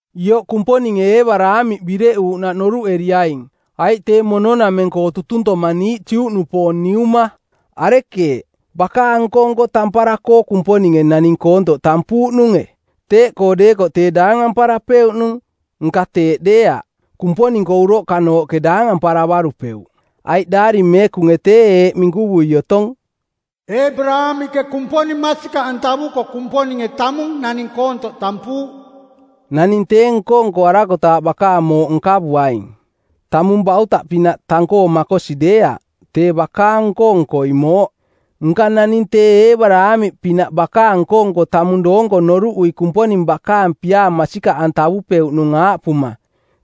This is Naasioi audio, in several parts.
Ioꞌ Kumponinge Eebaraamiꞌ bireꞌuuꞌnaꞌ noruꞌeriaing, aiꞌ tee mono-nameng-koo tutuntomaa niiꞌ Juꞌnupoong niuma. Arekeeꞌ, bakaang nko-nko tampara-koo Kumponinge naning koontoꞌ tampuuꞌnunge? Teeꞌkoo deekoꞌ tee daangamparapeuꞌnung. Nka teeꞌ deeaꞌ. Kumponing-koo uroꞌkanooꞌke daangamparavarupeuꞌ. Aiꞌ Daari Meekunge tee eeꞌ minkuvui otong, “Eebaraamiꞌke Kumponing masikaꞌantavuko Kumponinge tamung naning koontoꞌ tampuuꞌ.” Naning tee nko-nkoarakotaaꞌ bakaang mooꞌ nkavuaing. Tamung bautaꞌpinaꞌ tang-koo makosi deeaꞌ, tee bakaang nko-nkoi mooꞌ. Nka naning tee Eebaraamiꞌpinaꞌ bakaang nko-nko tamung doonko noruꞌui Kumponing bakaang piaa masikaꞌantavupeuꞌnung aaꞌpuma: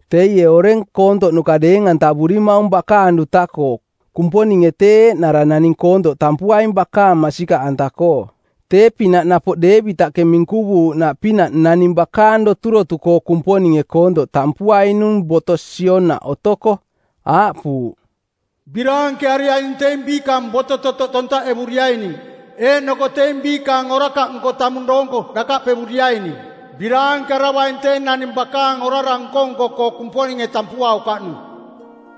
Teie oreng koontoꞌnuka deeng-antavurimaung bakaang duta-koo, Kumponinge tee eeꞌnara naning koontoꞌ tampuaing bakaang masikaꞌanta-koo. Tee-pinaꞌ napoꞌ Deevitaꞌke minkuvuuꞌnaꞌpinaꞌ naning bakaang doturoto-koo Kumponinge koontoꞌ tampuainung boto sionaꞌ otoko. Aaꞌpuuꞌ, “Biraankeariaining teing biikaang boto-totoꞌ tontaꞌevuriaining eeꞌnoko teing biikaang orakaꞌnko tamung doonko dakaꞌpevuriaining. “Biraankearavaing tee naning bakaang orara nko-nko-koo Kumponinge tampuaukaꞌnung.”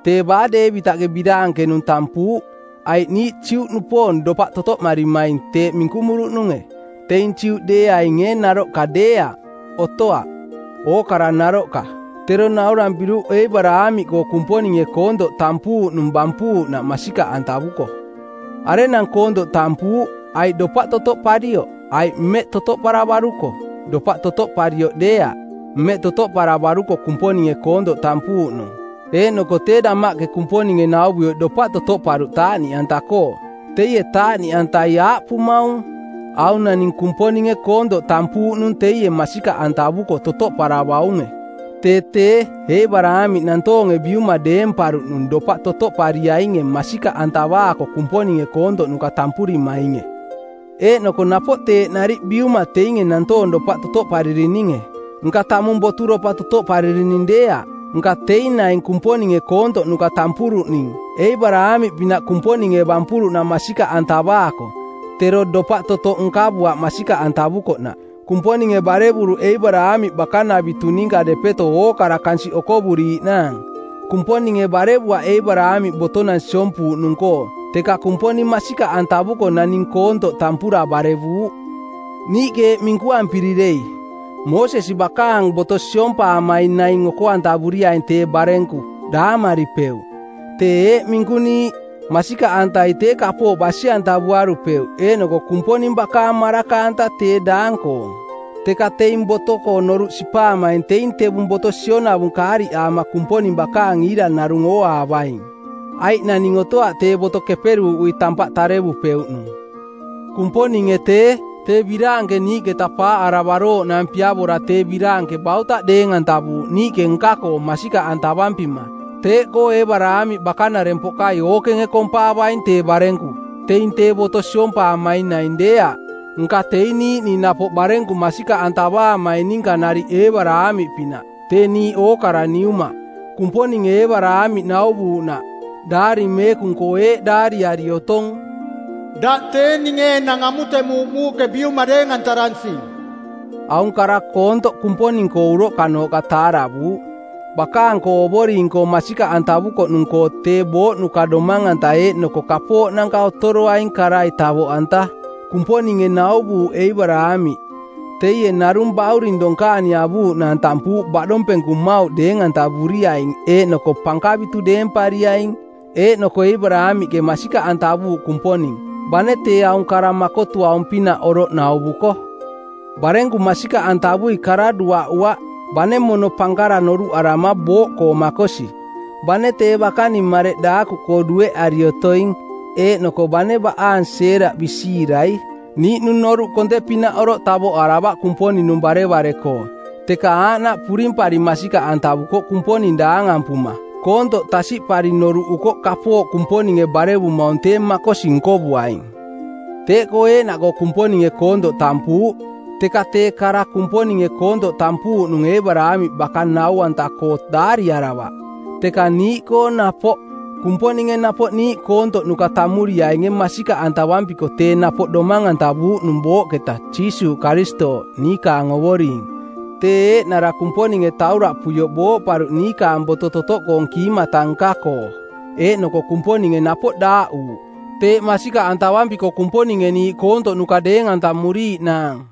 Tee baa Deevitaꞌke biraankenung tampuuꞌ? Aiꞌ niiꞌ Juꞌnupoong dopaꞌ totoꞌmarimaing teeꞌ minkumuruꞌnunge, teing Juꞌdeeaing ee naroꞌka deeaꞌ? Otoaꞌ, ookara naroꞌka. Tero naurampiruꞌ Eebaraamiꞌkoo Kumponinge koontoꞌ tampuuꞌnung bampuuꞌnaꞌ masikaꞌantavuko. Arenang koontoꞌ tampuuꞌ, aiꞌ dopaꞌ totoꞌparioꞌ aiꞌ mmeꞌ totoꞌparavaruko? Dopaꞌ totoꞌparioꞌ deeaꞌ. Mmeꞌ totoꞌparavaruko Kumponinge koontoꞌ tampuuꞌnung. Eeꞌnoko tee damaꞌke Kumponinge nauvuioꞌ dopaꞌ totoꞌparuꞌ taaꞌniꞌanta-koo. Teie taaꞌniꞌantai aaꞌpumaung: Aung naning Kumponinge koontoꞌ tampuuꞌnung teie masikaꞌantavuko totoꞌparavaunge. Tee tee, Eebaraamiꞌ nantoonge biuma deemparuꞌnung dopaꞌ totoꞌpariainge masikaꞌantavaako Kumponinge koontoꞌnuka tampurimainge. Eeꞌnoko napoꞌ teeꞌ nariꞌ biuma teinge nantoong dopaꞌ totoꞌparirininge. Nka tamung boturopa totoꞌparirining deeaꞌ, nka teing naing Kumponinge koontoꞌnuka tampuruꞌning Eebaraamiꞌpinaꞌ Kumponinge bampuruꞌnaꞌ masikaꞌantavaako, tero dopaꞌ totoꞌ nkavuaꞌ masikaꞌantavukoꞌnaꞌ. Kumponinge barevuruꞌ Eebaraamiꞌ bakanavitu ninka depeto ookara kansiꞌ okovorooꞌnaang. Kumponinge barevuaꞌ Eebaraamiꞌ botonang siompuuꞌnung-koo, teka Kumponing masikaꞌantavuko naning koontoꞌ tampura barevuuꞌ. Niiꞌke eeꞌ minkuampiri dei: Moosesi bakaang boto siompaamaing naing oko-antavuriaing tee barenku daamaripeuꞌ. Teeꞌ eeꞌ minkuniiꞌ: Masikaꞌantai tee kapooꞌ basi-antavuarupeuꞌ eeꞌnoko Kumponinge bakaang maraka-anta tee daang-koong. Teka teing boto-koo noruꞌ sipaamaing teing tevung boto sionavung kaariꞌaama Kumponing bakaang iira narung ooaavaing, aiꞌ naning otoaꞌ tee boto keperuuꞌui tampaꞌ tarevupeuꞌnung. Kumponinge tee, tee biraanke niiꞌketa paaꞌaravarooꞌnaang piavora tee biraanke bautaꞌ deeng-antavuuꞌ niiꞌke nka-koo masikaꞌantavampima. Teeꞌkoo Eebaraamiꞌ bakanarempoꞌkai ookenge kompaavaing tee barenku, teing tee boto siompaamaing naing deeaꞌ, nka teing niiꞌning napoꞌ barenku masikaꞌantavaamaing ninka nariꞌ Eebaraamiꞌpinaꞌ, tee niiꞌ ookara niuma. Kumponinge Eebaraamiꞌ nauvuuꞌnaꞌ, Daari Meekung-koo eeꞌ daariari otong, “Daꞌ tee ninge enang amutemuuꞌ muuꞌke biuma deeng-antaransing.” Aung kara koontoꞌ Kumponing-koo uroꞌkanooꞌka taaravuuꞌ, bakaang-koo Ovoring-koo masikaꞌantavukoꞌnung-koo tee booꞌnuka domang-anta eeꞌnoko kapooꞌnanka otoroaing karai tavoꞌanta. Kumponinge nauvuuꞌ Eebaraamiꞌ, teie narung bauring donkaani avuuꞌnaang tampuuꞌ baꞌdompenku mmauꞌ deeng-antavuriaing eeꞌnoko pankavitu deempariaing. Eeꞌnoko Eebaraamiꞌke masikaꞌantavuuꞌ Kumponing, bane tee aung kara makotuaung-pinaꞌ oroꞌ nauvuko. Barenku masikaꞌantavui kara duaꞌuaꞌ, bane mono pankara noruꞌarama booꞌkoo makosi, bane tee bakaning mareꞌ daakuꞌkoo dueꞌari otoing eeꞌnoko bane baꞌaang Seeraꞌ bisiirai. Niiꞌnung noruꞌ konte-pinaꞌ oroꞌ tavoꞌaravaꞌ Kumponing-nung barevare-koo, teka aaꞌnaꞌ purimpari masikaꞌantavukoꞌ Kumponing daangampuma. Koontoꞌ tasiꞌpari noruꞌukoꞌ kapooꞌ Kumponinge barevumaung tee makosi nkovuaing. Teeꞌkoo eeꞌnaꞌkoo Kumponinge koontoꞌ tampuuꞌ. Teka tee kara Kumponinge koontoꞌ tampuuꞌnung Eebaraamiꞌ baka nau-anta-koo daariaravaꞌ, teka niiꞌkoo napoꞌ. Kumponinge napoꞌ niiꞌ koontoꞌnuka tammuriainge masikaꞌantavampiko tee napoꞌ domang-antavuuꞌnung booꞌketa Jiisuuꞌ Karistooꞌ, niikaang Ovoring. Tee eeꞌnara Kumponinge tauraꞌpuioꞌ booꞌparuꞌ niikaang boto-totoꞌkoong kiimata nka-koo, eeꞌnoko Kumponinge napoꞌ daaꞌuuꞌ, teeꞌ masikaꞌantavampiko Kumponinge niiꞌ kontoꞌnuka deeng-antamuriiꞌnaang.